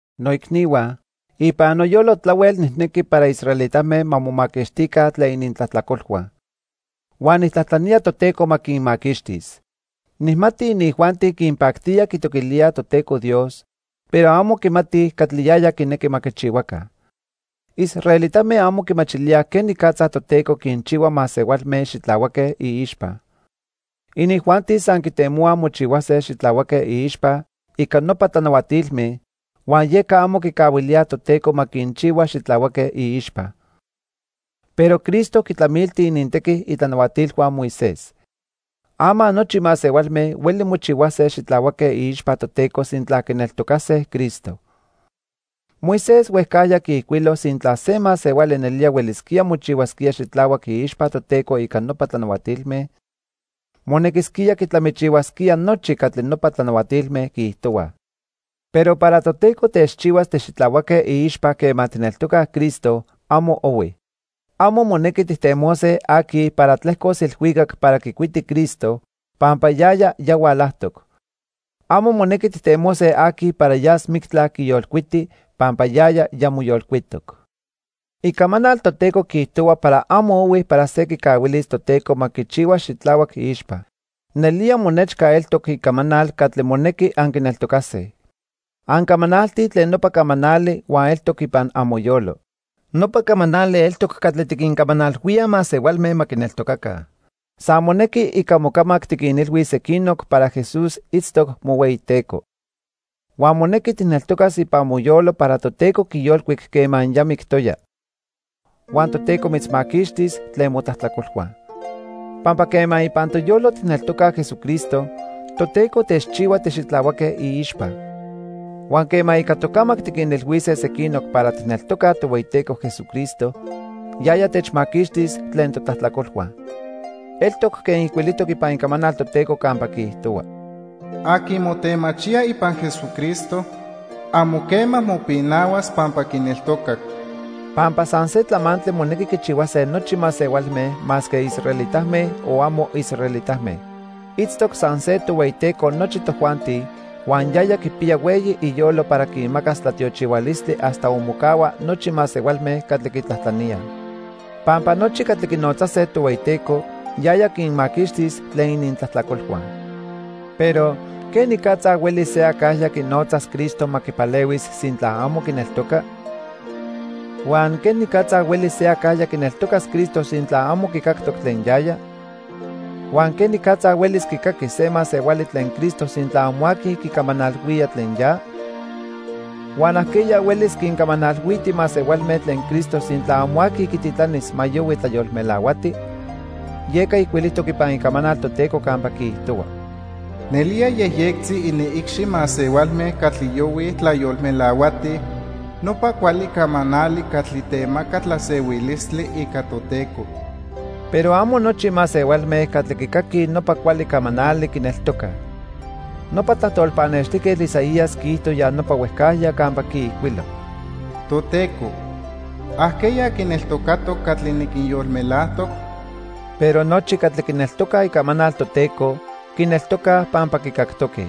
Noicnihua, ipan noyolo tlahuel nijnequi para israelitame ma momaquixtica tlen inintlajtlacolhua. Huan nijtlajtlanía Toteco ma quinmaquixtis. Nijmati inijuanti quinpactía quitoquilíaj Toteco Dios, pero amo quimatij catli yaya quinequi ma quichihuaca. Israelitame amo quimachilíaj quenicatza Toteco quinchihua masehualme xitlahuaque iixpa. Inijuanti san quitemohuaj mochihuase xitlahuaque iixpa ica nopa tlanahuatilme, huan yeca amo quicahuilíaj Toteco ma quinchihua xitlahuaque iixpa. Pero Cristo quitlamilti inintequi itlanahuatilhua Moisés. Ama nochi masehualme hueli mochihuase xitlahuaque iixpa Toteco sintla quineltocase Cristo. Moisés huejcajya quiijcuilo sintla se masehuali nelía huelisquía mochihuasquía xitlahuac iixpa Toteco ica nopa tlanahuatilme, monequisquía quitlamichihuasquía nochi catli nopa tlanahuatilme quiijtohuaj. Pero para Toteco techchihuas tixitlahuaque iixpa quema tijneltocaj Cristo, amo ohui. Amo monequi tijtemose aqui para tlejcos ilhuicac para quicuiti Cristo, pampa yaya ya hualajtoc. Amo monequi tijtemose aqui para yas mictla quiyolcuiti pampa yaya ya moyolcuitoc. Icamanal Toteco quiijtohua para amo ohui para se quicahuilis Toteco ma quichihua xitlahuac iixpa. Nelía monechca eltoc icamanal catli monequi anquineltocase. Ancamanaltij tlen nopa camanali huan eltoc ipan amoyolo. Nopa camanali eltoc catli tiquincamanalhuíaj masehualme ma quineltocaca. San monequi ica mocamac tiquinilhuis sequinoc para Jesús itztoc mohueyiTeco. Huan monequi tijneltocas ipan moyolo para Toteco quiyolcuic quema ya mictoya. Huan Toteco mitzmaquixtis tlen motlajtlacolhua. Pampa quema ipan toyolo tijneltocaj Jesucristo, Toteco techchihua tixitlahuaque iixpa. Huan quema ica tocamac tiquinilhuise sequinoc para tijneltocaj Tohueyiteco Jesucristo, yaya techmaquixtis tlen totlajtlacolhua. Eltoc quen ijcuilijtoc ipan Icamanal Toteco campa quiijtohua: "Aqui motemachía ipan Jesucristo, amo quema mopinahuas pampa quineltocac." Pampa san se tlamantli monequi quichihuase nochi masehualme masque israelitame, o amo israelitame. Itztoc san se Tohueyiteco nochi tojuanti, huan yaya quipiya hueyi iyolo para quinmacas tlatiochihualistli hasta onmocahua nochi masehualme catli quitlajtlaníaj. Pampa nochi catli quinotzase Tohueyiteco, yaya quinmaquixtis tlen inintlajtlacolhua. Pero ¿quenicatza huelis se acajya quinotzas Cristo ma quipalehuis sintla amo quineltoca? Huan ¿quenicatza huelis se acajya quineltocas Cristo sintla amo quicactoc tlen yaya? Huan ¿quenicatza huelis quicaquis se masehuali tlen Cristo sintla amo aqui quicamanalhuía tlen ya? Huan ¿ajqueya huelis quincamanalhuiti masehualme tlen Cristo sintla amo aqui quititlanis ma yohui tlayolmelahuati? Yeca ijcuilijtoc ipan Icamanal Toteco campa quiijtohua: "Nelía yejyectzi iniicxi masehualme catli yohuij tlayolmelahuatij nopa cuali camanali catli temaca tlasehuilistli ica Toteco." Pero amo nochi masehualme catli quicaquij nopa cuali camanali, quineltocaj. Nopa tlajtol pannextijquetl Isaías quiijto ya nopa huejcajya campa quiijcuilo: "Toteco, ¿ajqueya quineltocatoc catli niquinyolmelajtoc?" Pero nochi catli quineltocaj icamanal Toteco, quineltocaj pampa quicactoque.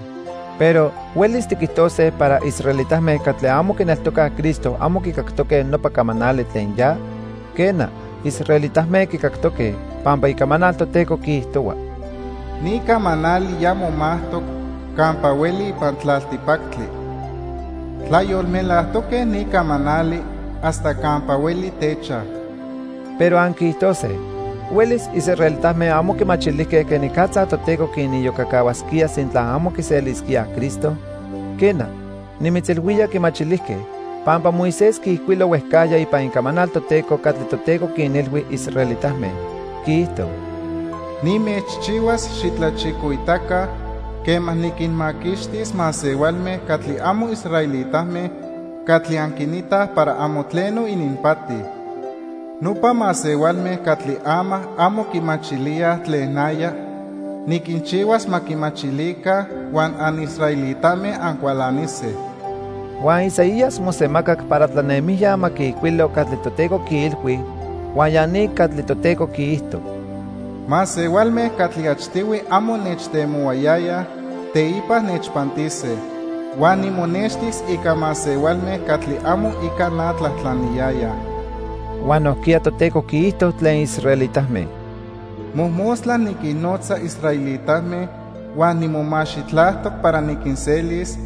Pero ¿huelis tiquijtose para israelitame catli amo quineltocaj Cristo amo quicactoque nopa camanali tlen ya? Quena, israelitame quicactoque, pampa Icamanal Toteco quiijtohua: "Ni camanali ya momajtoc campa hueli ipan tlaltipactli. Tlayolmelajtoque ni camanali hasta campa hueli techaj." Pero anquiijtose: "¿Huelis israelitame amo quimachilijque quenicatza Toteco quiniyocacahuasquía sintla amo quiselisquíaj Cristo?" Quena, nimitzilhuía quimachilijque, pampa Moisés quiijcuilo huejcajya ipan Icamanal Toteco catli Toteco quinilhui israelitame, quiijto: "Nimechchihuas xitlachicoitaca quema niquinmaquixtis masehualme catli amo israelitame catli anquinitaj para amo tleno ininpati. Nopa masehualme catli ama amo quimachilíaj tlen naya, niquinchihuas ma quimachilica huan anisraelitame ancualanise." Huan Isaías mosemacac para tlanemijya ma quiijcuilo catli Toteco quiilhui huan ya ni catli Toteco quiijto: "Masehualme catli achtihui amo nechtemohuayayaj, teipa nechpantise. Huan nimonextis ica masehualme catli amo ica na tlajtlaniyayaj." Huan nojquiya Toteco quiijto tlen israelitame: "Mojmostla niquinnotza israelitame huan nimomaxitlajtoc para niquinselis,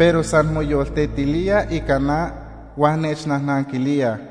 Pero san moyoltetilíaj ica na huan nechnajnanquilíaj."